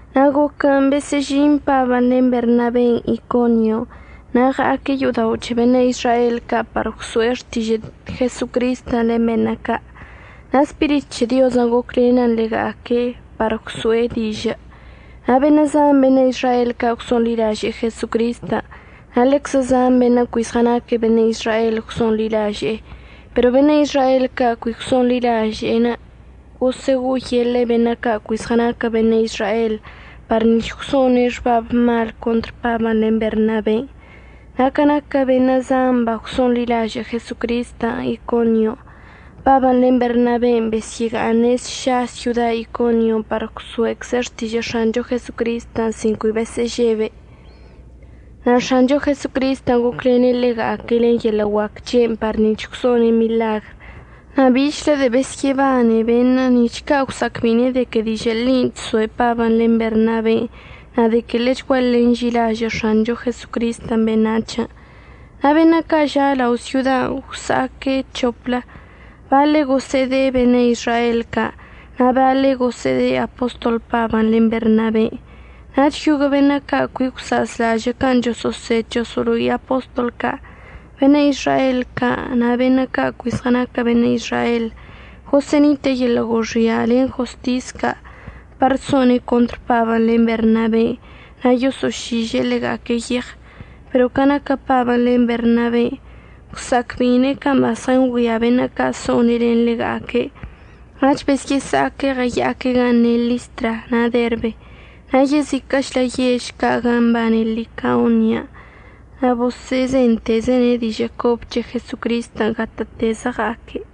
Na' goquən' besə'əžin Pabən' len Bernaben' Iconion' na' ɉa'aque' yo'odao' c̱he beṉə' Izrael ca' par gwso'e xtižə' Jesocristən' len beṉə' ca'. Na' Spirit c̱he Diozən' goclenən ḻega'aque' par gwso'e dižə'ən, na' beṉə' zan beṉə' Izrael ca' gwso'onḻilaže'e Jesocristən' na' ḻeczə zan beṉə' cui zɉənaquə beṉə' Izrael gwso'onḻilaže'ene'. Pero beṉə' Izrael ca' cui gwso'onḻilažə' gosə'əgo'oyeḻe'e beṉə' ca' cui zɉənaquə beṉə' Izrael par nic̱h gwso'one' xbab mal contr Pabən' len Bernaben'. Na' ca naquə beṉə' zan bagwso'onḻilažə' Jesocristən' Iconion', Pabən' len Bernaben' besyə'əga'aṉe' sša syoda Iconion' par gwso'ecze' xtižə' X̱ancho Jesocristən' sin cui besə'əžebe'. Na' X̱ancho Jesocristən' goclene' ḻega'aque' len yeḻə' guac c̱he'enə' par nic̱h gwso'one' miḻagr na' bichlə de'e besyə'əbane beṉə' nic̱h ca' gwsa'acbeine' de que dižə' ḻin' chsoe' Pabən' len Bernaben' na' de que ḻechguaḻe nži'ilažə' X̱ancho Jesocristən' beṉac̱hən'. Na' beṉə' ca' ža' lao' syodan' gwsa'aque' c̱hoplə. Baḻe' gosə'əde'e beṉə' Izrael ca' na' baḻe' gosə'əde'e apostol Pabən' len Bernaben'. Nach yoguə' beṉə' ca' cui gwsa'azlažə' can' choso'osed choso'olo'i apostol ca', beṉə' Izrael ca' na' beṉə' ca' cui zɉənaquə beṉə' Izrael, gosə'ənite'e yeḻə' goxia' len jostis ca' par so'one' contr Pabən' len Bernaben' na' yoso'ošiže'e ḻega'aque' yeɉ. Pero ca naquə Pabən' len Bernaben' gwsa'acbeine' can' bazɉəngüia beṉə' ca' so'one' len ḻega'aque', nach besyə'əsa'aque' ɉəya'aque' gan' ne' Listra na' Derbe, na' yeziquə'əchlə yež ca' gan' mbane Licaonia. Na' boso'ozentezene' dižə' cobə c̱he Jesocristən' gatə'ətezə ɉa'aque'.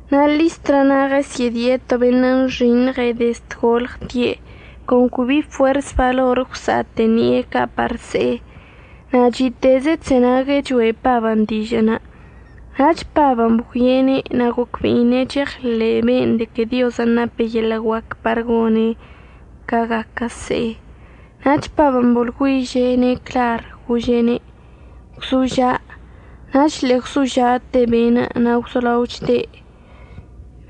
Na' Listra na' ɉəsyə'ədie' to beṉə' nxiṉɉe' dezd golɉte', con cui bi bi fuers balor əgwsa'ate'e ṉi'e ca' par se'e. Na' chi'iteze' chzenague' choe' Pabən' dižə'ənə'. Nach Pabən' bgüie'ene' na' gocbe'ine' cheɉḻe' be'enə' de que Diozən' nape' yeḻə' guac par gone' ca gaquə se'e. Nach Pabən' boḻgüiže'ene' clar gože'ene': ―Gwzoža'. Nach ḻe'e gwzoža'ate be'enə' na' gwzolao chde'.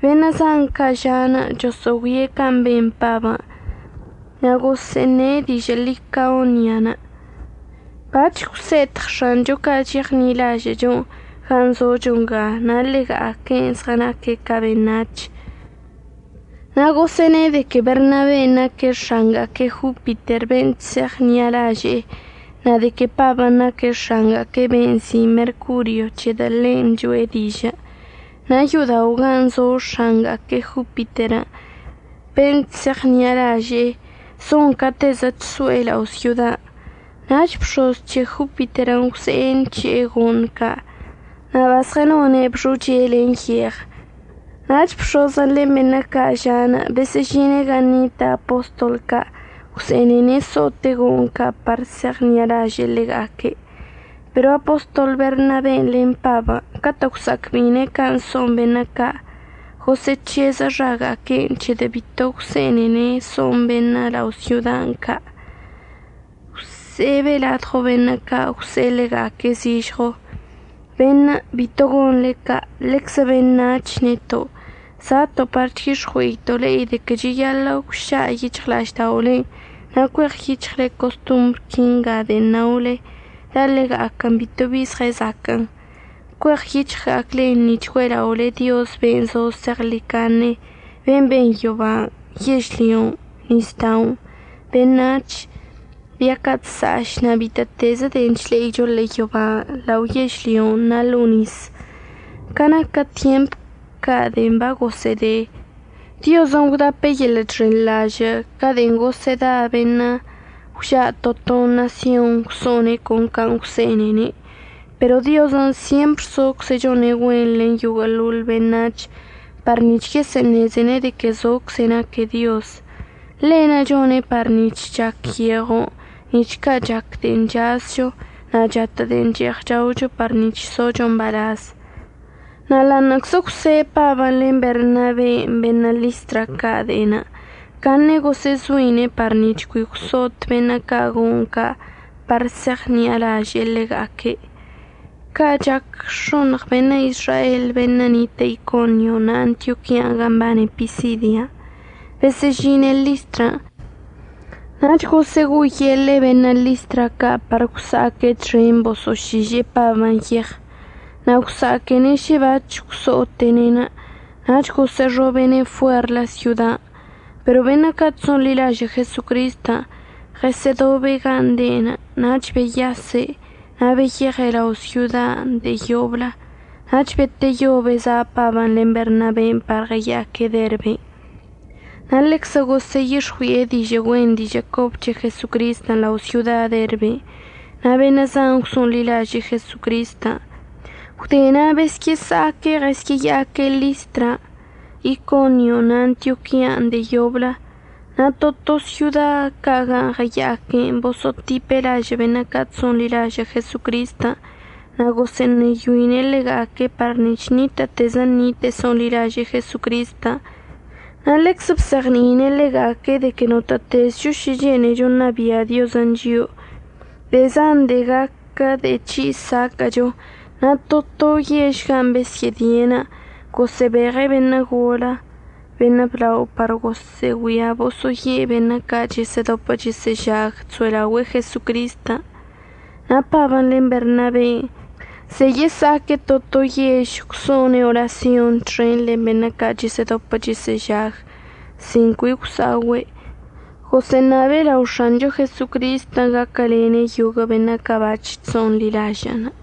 Beṉə' zan ca' ža'anə' choso'ogüie' can' ben Pabən' na' gosə'əne' dižə' Licaonia: ―Bac̱h gwse'etɉ X̱ancho ca' cheɉṉi'alažə'əcho gan' zocho nga na' ḻega'aque'en zɉənaque' ca beṉac̱h. Na' gosə'əne' de que Bernaben' naque' x̱anga'aque' Jopiter ben' chse'eɉṉi'alaže'e, na' de que Pabən' naque' x̱anga'aque' ben' nzi' Mercorio c̱hedə' ḻen' choe' dižə'. Na' yo'odao' gan' zo x̱anga'aque' Jopiter ben' chse'eɉṉi'alaže'e zon catezə chso'e lao' syodan'. Nach bx̱oz c̱he Jopiterən' gwze'e nc̱he'e go'oṉ ca' na' bazɉənone'eb xoche len yeɉ. Nach bx̱ozən' len beṉə' ca' ža'anə' besə'əžine' gan' nitə' apostol ca' gwse'enene' so'ote' go'oṉ ca' par se'eɉṉi'alaže'e ḻega'aque'. Pero apostol Bernaben' len Pabən' catə' gwsa'acbe'ine' can' so'on beṉə' ca', gosə'əc̱heze' xaga'aque'enə' c̱hedə' bito gwse'enene' so'on beṉə' lao' syodan' ca'. Gwse'ebe' ladɉo beṉə' ca' gwse'e ḻega'aque' zižɉo: ―Beṉə' bito gonḻe ca'. Ḻeczə beṉac̱h neto'. Za'ato' par chyix̱ɉue'ito' le'e de que cheyaḻə' gwša' yic̱hɉla'ažda'olen' na' cueɉyic̱hɉle costombr quinga de'en naole la' ḻega'aquən bito bi zɉəzaquə'ən. Cueɉyic̱hɉga'aclen nic̱h güe'ela'ole Diozən' ben' zo zeɉḻicaṉe, ben' ben yoban', yežlyon', nisda'onə', beṉac̱h, bia ca' chsa'aš, na' bitə'ətezə de'en chle'icho ḻe'e yoban', lao yežlyon' na' ḻo'o nis. Ca naquə tyemp ca' de'en bagosə'əde, Diozən' gwdape' yeḻə' chxenḻažə' ca de'en gosə'əda beṉə' gwža' to to ṉasyon gwso'one' con can' gwse'enene'. Pero Diozən' syempr zocze' chone' güen len yoguə'əḻoḻ beṉac̱hən' par nic̱h yesə'əṉezene' de que zocze' naque' Dioz. Ḻe'enə' chone' par nic̱h chac yeɉon' nic̱h ca' chac de'en chazcho, na' chatə' de'en che'eɉ chaocho par nic̱h socho mbalaz. Na' ḻa'aṉə'əczə gwse' Pabən' len Bernaben' beṉə' Listra ca' de'enə', caṉe gosə'əzoine' par nic̱h cui gwso'ot beṉə' ca' go'oṉ ca' par se'eɉṉi'alaže'e ḻega'aque'. Ca' chac x̱oṉɉ beṉə' Izrael beṉə' nitə' Iconio na' Antioquian' gan' mbane Pisidia, besə'əžine' Listran', nach gosə'əgo'oyeḻe'e beṉə' Listra ca' par gwsa'aque' txen boso'ošiže'e Pabən' yeɉ. Na' gwsa'aquene' šə bac̱h gwso'ote'ene' nach gosə'əxobe'ene' fuerlə syodan'. Pero beṉə' ca' chso'onḻilažə' Jesocristən' ɉəsə'ədobe' gan' de'enə' nach beyase' na' beyeɉe' lao syodan' de'e yoblə. Nach beteyo beza' Pabən' len Bernaben' par ɉəya'aque' Derben'. Na' ḻeczə gosə'əyix̱ɉui'e dižə' güen dižə' cobə c̱he Jesocristən' lao' syoda Derben' na' beṉə' zan gwso'onḻilaže'e Jesocristən'. Gwde na' besyə'əsa'aque' ɉəsya'aque' Listran', Iconion' na' Antioquian' de'e yoblə. Na' to to syoda ca' gan' ɉəya'aque'enə' boso'otipe' lažə' beṉə' ca' chso'onḻilažə' Jesocristən' na' gosə'əṉeyoine' ḻega'aque' par nic̱h ṉitə'ətezə ṉite'e so'onḻilaže'e Jesocristən'. Na' ḻeczə bzeɉni'ine' ḻega'aque' de que notə'ətezcho šə chene'echo ṉabia' Diozən' chio'o, de'e zan de'e gaquə de'e c̱hi' saquə'əcho. Na' to to yež can' besyə'ədie'enə' gosə'əbeɉe' beṉə' golə beṉə' blao par boso'ogüia boso'oye' beṉə' ca' chəsə'ədopə chəsə'əžag chso'elaogüe'e Jesocristən'. Na' Pabən' len Bernaben' ze'e yesa'aque' to to yež gwso'one' orasyonṉə' txen len beṉə' ca' chəsə'ədopə chəsə'əžaguən' sin cui gwsa'ogüe', gosə'əṉabe' lao X̱ancho Jesocristən' gaquəlene' yoguə' beṉə' ca' bac̱h chso'onḻilaže'ene'.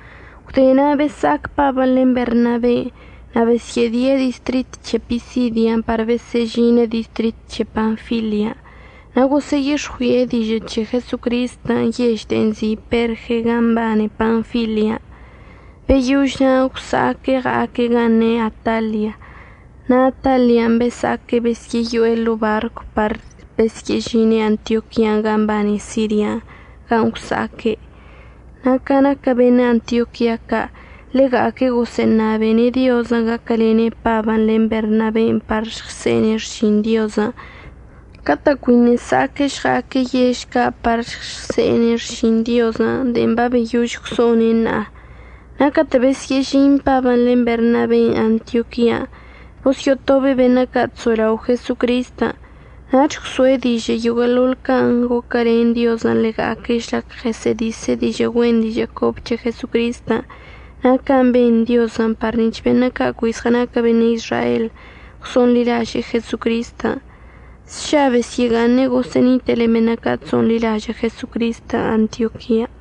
Gwde na' besa'ac Pabən' len Bernaben' na' besyə'ədie' distrit c̱he Pisidia par besə'əžine' distrit c̱he Panfilia. Na' gosə'əyix̱ɉui'e dižə' c̱he Jesocristən' yež de'en nzi' Perge gan' mbane Panfilian'. Beyož na' gwsa'aque' ɉa'aque' gan' ne' Atalia. Na' Atalian' besa'aque' besyə'əyo'e ḻo'o barcw par besyə'əžine' Antioquian' gan' mbane Sirian' gan' gwsa'aque'. Na' ca naquə beṉə' Antioquia ca' ḻega'aque' gosə'əṉabene' Diozən' gaquəlene' Pabən' len Bernaben' par žɉse'ene' xšin Diozən' catə' cuiṉə' əsa'aque' žɉa'aque' yež ca' par žɉse'ene' xšin Diozən' de'en babeyož gwso'one' ṉa'a. Na' catə' besyə'əžin Pabən' len Bernaben' Antioquian', bosyo'otobe' beṉə' ca' chso'elao' Jesocristən' nach gwso'e dižə' yoguə'əḻoḻ can' goquəlen Diozən' ḻega'aque' žlac ɉəsə'ədise' dižə' güen dižə' cobə c̱he Jesocristən' na' can' ben Diozən' par nic̱h beṉə' ca' cui zɉənaquə beṉə' Izrael gwso'onḻilaže'e Jesocristən'. Sša besyə'əga'aṉe' gosə'ənite'e len beṉə' ca' chso'onḻilažə' Jesocristən' Antioquian'.